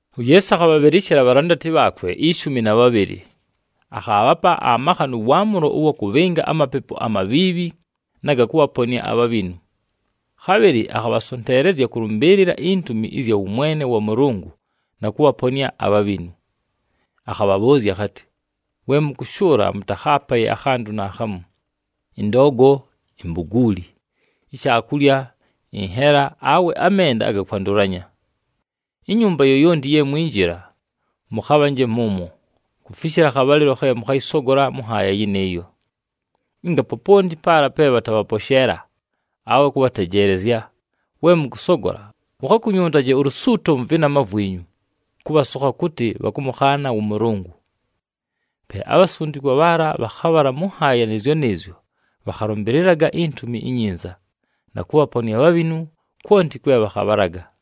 UYeesu akhabhabhɨlɨshɨla abhalandati bhaakwe ishumi na bhabhɨlɨ. Akhaabhapa amakha nʉ waamʉlo ʉwa kʉbhɨnga amapepu amabhiibhi, na ga kʉbhaponɨa abhabhinu. Khabhɨlɨ akhabhasonteelezya kʉlʉmbɨɨlɨla intumi ɨzya wʉmwene wa Mʉlʉngʉ na kʉbhaponɨa abhabhinu. Akhabhabhʉʉzya akhatɨ, “We mʉkʉshʉʉla, mʉtakhaapaye akhantʉ naakhamu: ɨndoogo, imbuguuli, ishaakulya, ɨnhela, awe amenda aga kwandʉlanya. Inyumba yoyonti ye mwinjila, mʉkhabhanje mʉmwo, kufishila akhabhalɨlo khe mʉkhayɨsogola mʉ nhaaya yɨnɨɨyo. Ɨnga poponti paala pe bhatabhaposheela awe kʉbhatejeelezya, we mʉkʉsogola, mukhakunyuntaje ulusuuto mʉ vɨnama vwinyu, kʉbhasokha kʉtɨ bhakʉmʉkhaana wʉ Mʉlʉngʉ.” Pe abhasundikwa bhaala bhakhabhala mʉ nhaaya nɨɨzyo nɨɨzyo bhakhalʉmbɨlɨlaga iNtumi iNyinza, na kʉbhaponɨa abhabhinu kwonti kwe bhakhabhalaga.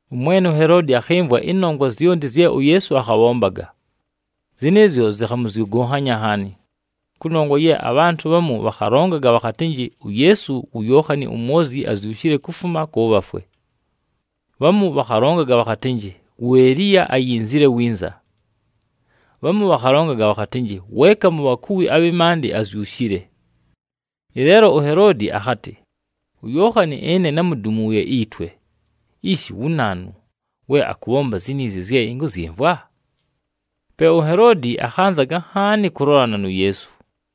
Ʉmwene uHeloodi akhɨmvwa ɨnongwa zyonti zye uYeesu akhabhombaga. Zɨnɨɨzyo zɨkhamʉzyʉgʉnhanya nhaani, kʉnongwa ye abhantʉ bhamu bhakhalongaga bhakhatɨnjɨ uYeesu wu Yookhani uMwozyi azyushile kufuma kʉ bhafwe. Bhamu bhakhalongaga bhakhatɨnjɨ, wu Eliya ayinzile winza. Bhamu bhakhalongaga bhakhatɨnjɨ, weeka mu bhakuwi abhɨ maandɨ azyushile. Ɨleelo uHeloodi akhatɨ, “UYookhani ɨne námudumuuye itwe! Ishi, wu naanu we akʉbhomba ziniizi zye ɨnkʉzyɨmvwa?” Pe uHeloodi akhanzaga nhaani kʉlolana nu Yeesu.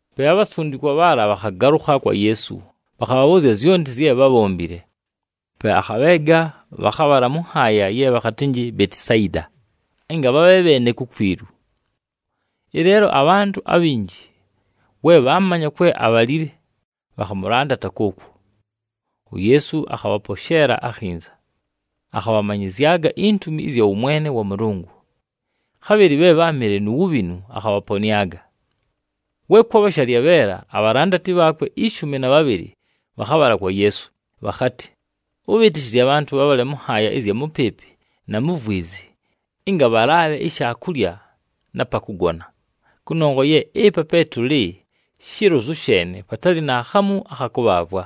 Pe abhasundikwa bhaala bhakhagalʉkha kwa Yeesu, bhakhamʉbhʉʉzya zyonti zye bhábhombile. Pe akhabheega, bhakhabhala mʉ nhaaya ye bhakhatɨnjɨ Betisayida, ɨnga bhabhe bheene kukwilu. Ɨleelo abhantʉ abhinji we bhaamanya kwe abhalile, bhakhamʉlandata kʉʉkwo. UYeesu akhabhaposheela akhinza, akhabhamanyɨzyaga intumi ɨzya wʉmwene wa Mʉlʉngʉ. Khabhɨlɨ bhe bháamɨle nu wubhinu, akhabhaponɨaga. We kwabha shalyabheela, abhalandati bhaakwe ishumi na bhabhɨlɨ bhakhabhala kwa Yeesu, bhakhatɨ, “Ʉbhɨtɨshɨzye abhantʉ bhabhale mʉ nhaaya ɨzya mʉpɨɨpɨ na mu vwizi, ɨnga bhalaabhe ishaakulya na pa kʉgona, kʉnongwa ye ɨpa pe tʉlɨ shilozu sheene patalɨ naakhamu akha kʉbhaavwa.”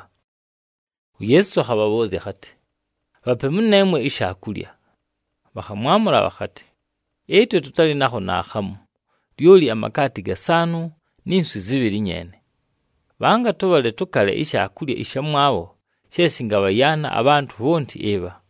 UYeesu akhabhabhʉʉzya akhatɨ, “Bhape mʉneemwe ishaakulya!” Bhakhamwamʉla bhakhatɨ, “Ɨtwe tʉtalɨ nakho naakhamu, lyoli amakaati gasaanʉ ni nswi zɨbhɨlɨ nyeene. Bhanga tʉbhale tʉkale ishaakulya ɨshamwabho she shɨngabhakwɨla abhantʉ bhonti ɨbha!”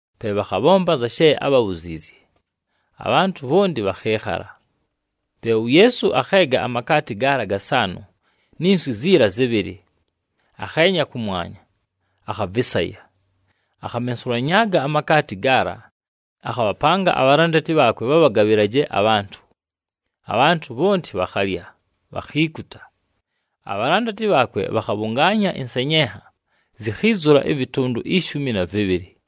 Pe bhakhabhomba anza she ábhabhuziizye, abhantʉ bhonti bhakhɨɨkhala. Pe uYeesu akheega amakaati gaala gasaanʉ ni nswi ziila zɨbhɨlɨ, akheenya kʉmwanya, akhavɨsaya. Akhamensulanyaaga amakaati gaala, akhabhapanga abhalandati bhaakwe bhabhagabhɨlaje abhantʉ. Abhantʉ bhonti bhakhalya, bhakhiikuta. Abhalandati bhaakwe bhakhabhʉngaanya ɨnsenyenha, zikhiizula ɨvɨtʉndʉ ishumi na vɨbhɨlɨ.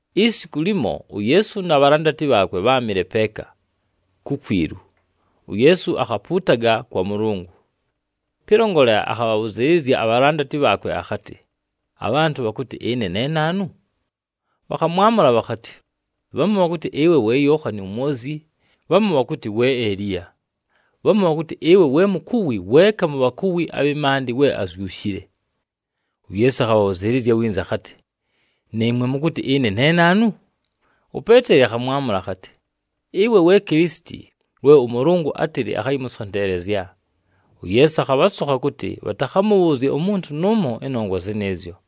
Isiku limo, uYeesu na bhalandati bhaakwe bháamɨle peeka, kukwilu, uYeesu akhapuutaga kwa Mʉlʉngʉ. Pɨlongolela, akhabhabhʉzɨɨlɨzya abhalandati bhaakwe akhatɨ, “Abhantʉ bhakʉtɨ ɨne ne naanu?” Bhakhamwamʉla bhakhatɨ, “Bhamu bhakʉtɨ, ɨwe we Yookhani uMwozyi, bhamu bhakʉtɨ we Eliya. Bhamu bhakʉtɨ ɨwe we mukuwi weeka mu bhakuwi abhɨ maandɨ we azyushile.” UYeesu akhabhabhʉzɨɨlɨzya winza akhatɨ, “Nɨɨmwe, mʉkʉtɨ ɨne ne naanu?” UPeeteli akhamwamʉla akhatɨ, “Ɨwe we Kilisiti, we ʉMʉlʉngʉ átɨlɨ akhayɨmʉsonteelezya!” UYeesu akhabhasokha kʉtɨ, bhatakhamʉbhʉʉzye umuntu nʉʉmo ɨnongwa zɨnɨɨzyo.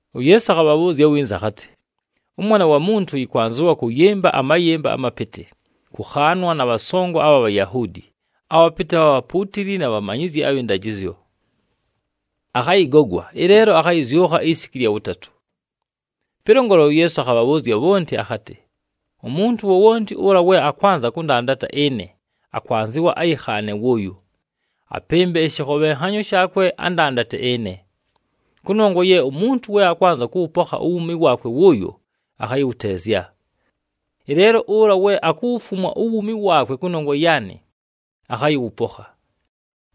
UYeesu akhabhabhʉʉzya winza akhatɨ, “ɄMwana wa Muntu yɨkwanzɨwa kʉyɨmba amayɨmba amapɨtɨ, kʉkhaanwa na bhasongo abha Bhayahuudi, abhapɨtɨ abha bhapuutili na bhamanyizyi abhɨ ndajɨzyo. Akhayɨgogwa, ɨleelo akhayɨzyʉkha isiku ɨlya wʉtatʉ.” Pɨlongolela, uYeesu akhabhabhʉʉzya bhonti akhatɨ, “Umuntu wowonti ʉla we akwanza kʉndandata ɨne, akwanzɨwa ayɨkhaane wʉʉyo, apɨmbe ɨshɨkhobhenhanyo shaakwe, andandate ɨne. Kʉnongwa ye umuntu we akwanza kʉwʉpokha uwuumi waakwe wʉʉyo, akhayɨwʉteezya. Ɨleelo ʉla we akuwufumwa uwuumi waakwe kʉnongwa yaanɨ, akhayɨwʉpokha.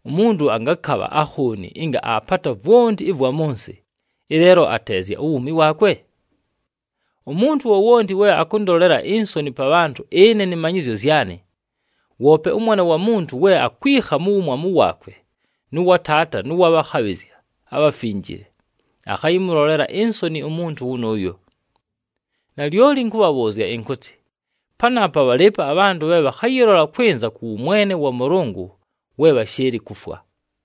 Umuntu angakabha akhooni ɨnga aapata vwonti ɨvwa mʉ nsɨ, ɨleelo ateezya uwuumi waakwe? Umuntu wowonti we akʉndolela insoni pa bhantʉ ɨne nɨ manyɨzyo zyanɨ, woope ʉMwana wa Muntu we akwikha mu wumwamu waakwe, nʉ wa Taata nʉ wa bhakhabhɨzya abhafinjile, akhayɨmʉlolela insoni umuntu wʉnʉʉyo. Nalyoli ɨnkʉbhabhʉʉzya ɨnkʉtɨ, panaapa bhalɨɨpo abhantʉ bhe bhakhayɨlola kwɨnza kʉ wʉmwene wa Mʉlʉngʉ we bhashɨɨlɨ kufwa.”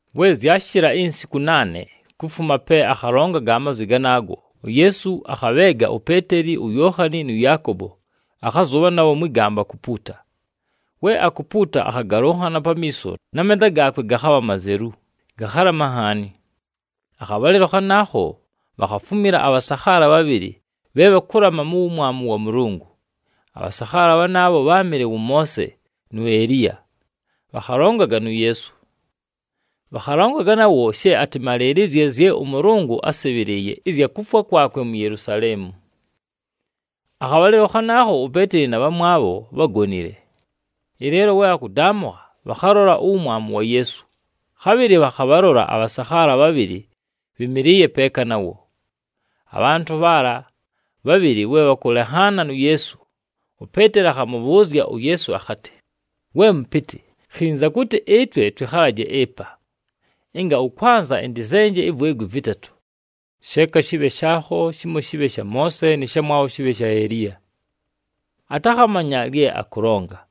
We zyashɨla insiku naane kufuma pe akhalongaga amazwi ganaago, uYeesu akhabheega uPeeteli, uYookhani, nʉ Yaakobo, akhazʉbha nabho mwɨ gamba kupuuta. We akupuuta, akhagalʉnhana pamiiso na menda gaakwe gakhabha mazelu, gakhalama nhaani. Akhabhalɨlo khanaakho, bhakhafumila abhasakhaala bhabhɨlɨ bhe bhakʉlama mu wumwamu wa Mʉlʉngʉ. Abhasakhaala bhanaabho bháamɨle wʉ Moose nu Eliya, bhakhalongaga nu Yeesu. Bhakhalongaga nawo she atɨmalɨɨlɨzye zye ʉMʉlʉngʉ ásɨbhɨlɨɨye, ɨzya kufwa kwakwe mu Yelusaleemu. Akhabhalɨlo khanaakho uPeeteli na bhamwabho bhágonile. Ɨleelo we bhakʉdaamʉkha, bhakhalola uwumwamu wa Yeesu, khabhɨlɨ bhakhabhalola abhasakhaala bhabhɨlɨ bhɨmɨlɨɨye peeka nawo. Abhantʉ bhaala bhabhɨlɨ we bhakʉlenhaana nu Yeesu, uPeeteli akhamʉbhʉʉzya uYeesu akhatɨ, “We mʉpɨtɨ, khinza kʉtɨ ɨtwe twɨkhalaje ɨpa! Ɨnga ʉkwanza, ɨntɨzenje ivwegwi vɨtatʉ: sheeka shɨbhe shaakho, shimo shɨbhe sha Moose, nɨ shamwabho shɨbhe sha Eliya.” Atakhamanya lye akʉlonga.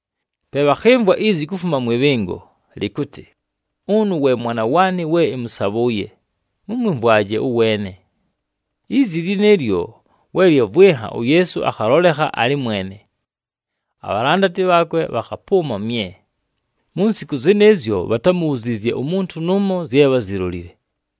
Pe bhakhɨmvwa izi kufuma mwɨ bhɨngo lɨkʉtɨ, “Ʉnʉ we Mwana waanɨ we ɨmʉsabhʉʉye, mʉmwɨmvwaje ʉweene!” Izi lɨnɨɨlyo we lyavwɨnha, uYeesu akhalolekha alɨ mwene. Abhalandati bhaakwe bhakhapʉʉma mye. Mu nsiku zɨnɨɨzyo bhatámubhuziizye umuntu nʉʉmo zye bházilolile.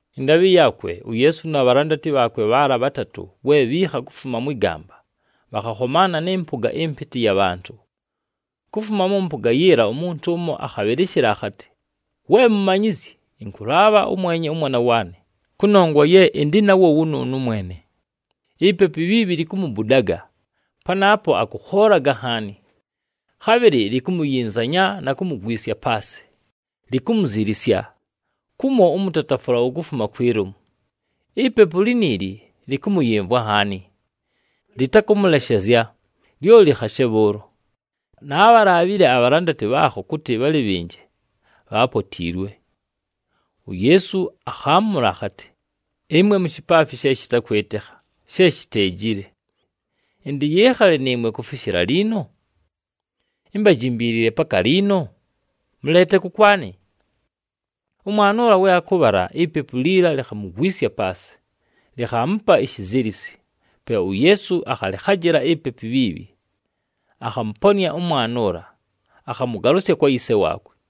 Ɨndaabhɨ yaakwe, uYeesu na bhalandati bhaala bhatatʉ we bhiikha kufuma mwɨ gamba, bhakhakhomaana nɨ mpʉga ɨmpɨtɨ ɨya bhantʉ. Kufuma mʉ mpʉga yiila umuntu ʉmo akhabhɨlɨshɨla akhatɨ, “We Mumanyizyi, ɨnkʉlaabha ʉmwenye ʉmwana waanɨ, kʉnongwa ye ɨndɨ nawo wʉnʉʉnʉ mwene. Ipepu ibhiibhi likumubudaga, panaapo akʉkhoolaga nhaani. Khabhɨlɨ likumuyinzanya na kumugwisya paasɨ, likumuzilisya, kumo ʉmʉtatafʉla wukumufuma kwi lomu. Ipepu liniili lɨkʉmʉyɨmvwa nhaani, lɨtakʉmʉleshezya, lyoli khashe bhʉʉlo. Naabhalaabhile abhalandati bhaakho kʉtɨ bhalɨbhɨnje, bhaapotiilwe.” UYeesu akhaamʉla akhatɨ, “Ɨmwe mushipaafi she shɨtakwɨtɨkha, she shiteejile. Ɨntɨyɨɨkhale nɨɨmwe kufishila liino? Imbajimbiilile paka liino? Mʉleete kʉkwanɨ.” We bhakʉmʉtwala, ipepu liila likhamugwisya paasɨ, likhaamupa ishizilisi. Pe uYeesu akhalɨkhajɨla ipepu ibhiibhi, akhamʉponɨa ʉmwana ʉla, akhamʉgalʉsya kwa yise waakwe.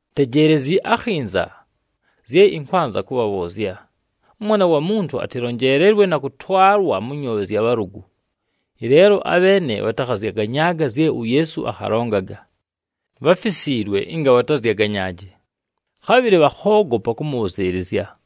“Tejeelezyi akhinza zye ɨnkwanza kʉbhabhʉʉzya: ʉMwana wa Muntu atɨlonjeelelwe na kʉtwalwa mʉ nyoobhe zya bhalʉgʉ.” Ɨleelo abheene bhatakhazyaganyaaga zye uYeesu akhalongaga. Bháfisiilwe ɨnga bhatazyaganyaaje, khabhɨlɨ bhakhoogopa kʉmʉbhʉzɨɨlɨzya.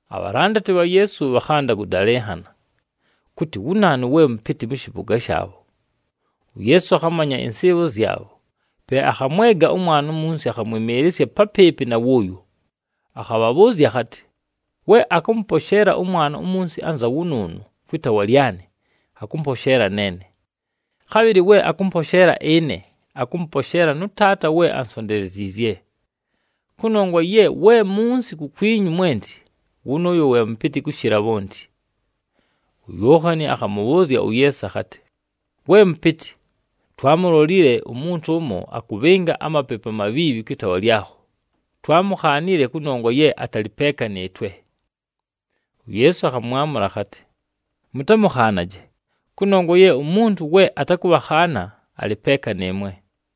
Abhalandati bha Yeesu bhakhanda kʉdalɨnhana kʉtɨ wu naanu we mʉpɨtɨ mʉ shɨpʉga shaabho. UYeesu akhamanya ɨnsɨɨbho zyabho, pe akhamwega ʉmwana umunsi, akhamwɨmɨɨlɨsya papɨɨpɨ na wʉʉyo, akhabhabhʉʉzya akhatɨ, “We akʉmʉposheela ʉmwana umunsi anza wʉnʉʉnʉ kwɨ taawa lyanɨ, akʉmposheela neene. Khabhɨlɨ we akʉmposheela ɨne, akʉmʉposheela nʉ Taata we ansonteleziizye. Kʉnongwa ye we munsi kukwinyu mwenti, wʉnʉʉyo we mʉpɨtɨ kʉshɨla bhonti.” UYookhani akhamʉbhʉʉzya uYeesu akhatɨ, “We Mʉpɨtɨ, twaamulolile umuntu ʉmo akʉbhɨnga amapepu amabhiibhi kwɨ taawa lyakho, twaamukhaanile, kʉnongwa ye atalɨ peeka nɨɨtwe.” UYeesu akhamwamʉla akhatɨ, “Mʉtamʉkhaanaje, kʉnongwa ye umuntu we atakʉbhakhaana, alɨ peeka nɨɨmwe.”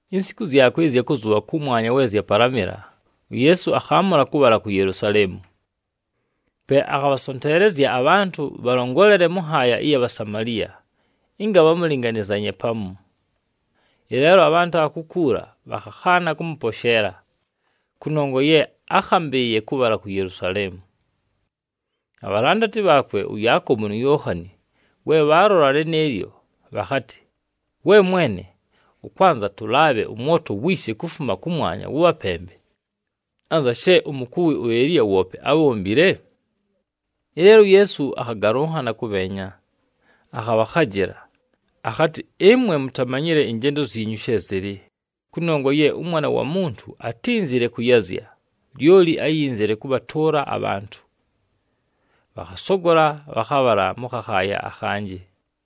Insiku zyakwe ɨzya kʉzʉbha kʉmwanya we zyapalamɨla, uYeesu akhaamʉla kʉbhala ku Yelusaleemu. Pe akhabhasonteelezya abhantʉ bhalongolele mʉ nhaaya ɨya Bhasamaliya ɨnga bhamʉlɨnganɨzanye pamu. Ɨleelo abhantʉ abha kukuula bhakhakhaana kʉmʉposheela, kʉnongwa ye ákhambɨɨye kʉbhala ku Yelusaleemu. Abhalandati bhaakwe ʉYaakobo nu Yookhani, we bhaalola lɨnɨɨlyo, bhakhatɨ, “We Mwene, ʉkwanza tʉlaabhe ʉmwoto wiishe kufuma kʉmwanya wʉbhapembe, [anza she umukuwi uEliya woope ábhombile]?” Ɨleelo uYeesu akhagalʉnhana kʉbheenya, akhabhakhajɨla. [Akhatɨ, “Ɨmwe mutamanyile ɨnjendo zyinyu she zɨlɨ, kʉnongwa ye ʉMwana wa Muntu atínzile kʉyazya, lyoli áyinzile kʉbhatʉʉla abhantʉ.”] Bhakhasogola bhakhabhala mʉ khakhaaya akhanjɨ.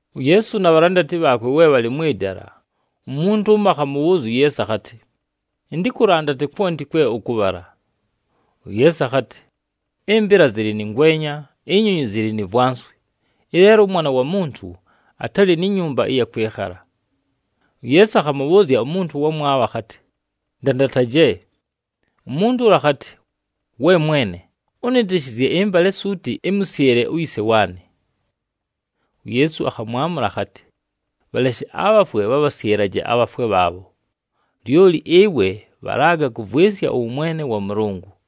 UYeesu na bhalandati bhaakwe we bhalɨ mwɨ dala, umuntu ʉmo akhamʉbhʉʉzya uYeesu akhatɨ, “Ɨntɨkʉlandate kwonti kwe ʉkʉbhala!” UYeesu akhatɨ, “Ɨmbɨla zɨlɨ nɨ ngwenya, inyonyi zɨlɨ ni vwanswi, ɨleelo ʉMwana wa Muntu atalɨ ni nyumba ɨya kwɨkhala.” UYeesu akhamʉbhʉʉzya umuntu ʉwamwabho akhatɨ, “Ndandataje!” Umuntu ʉla akhatɨ, “We Mwene, ʉnɨtɨshɨzye ɨmbale suuti, ɨmʉsyɨle uyise waanɨ.” UYeesu akhamwamʉla akhatɨ, “Bhaleshe abhafwe bhabhasyɨlaje abhafwe bhaabho. Lyoli ɨwe, bhalaga kʉvwɨnsya ʉwʉmwene wa Mʉlʉngʉ.”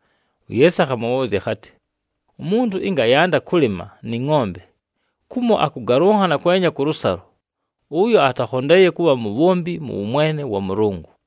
UYeesu akhamʉbhʉʉzya akhatɨ, “Umuntu ɨnga ayanda kʉlɨma nɨ ngʼombe, kumo akʉgalʉnhana kwenya kʉlʉsalo, ʉyo atakhondeeye kʉbha mubhombi mʉ wʉmwene wa Mʉlʉngʉ.”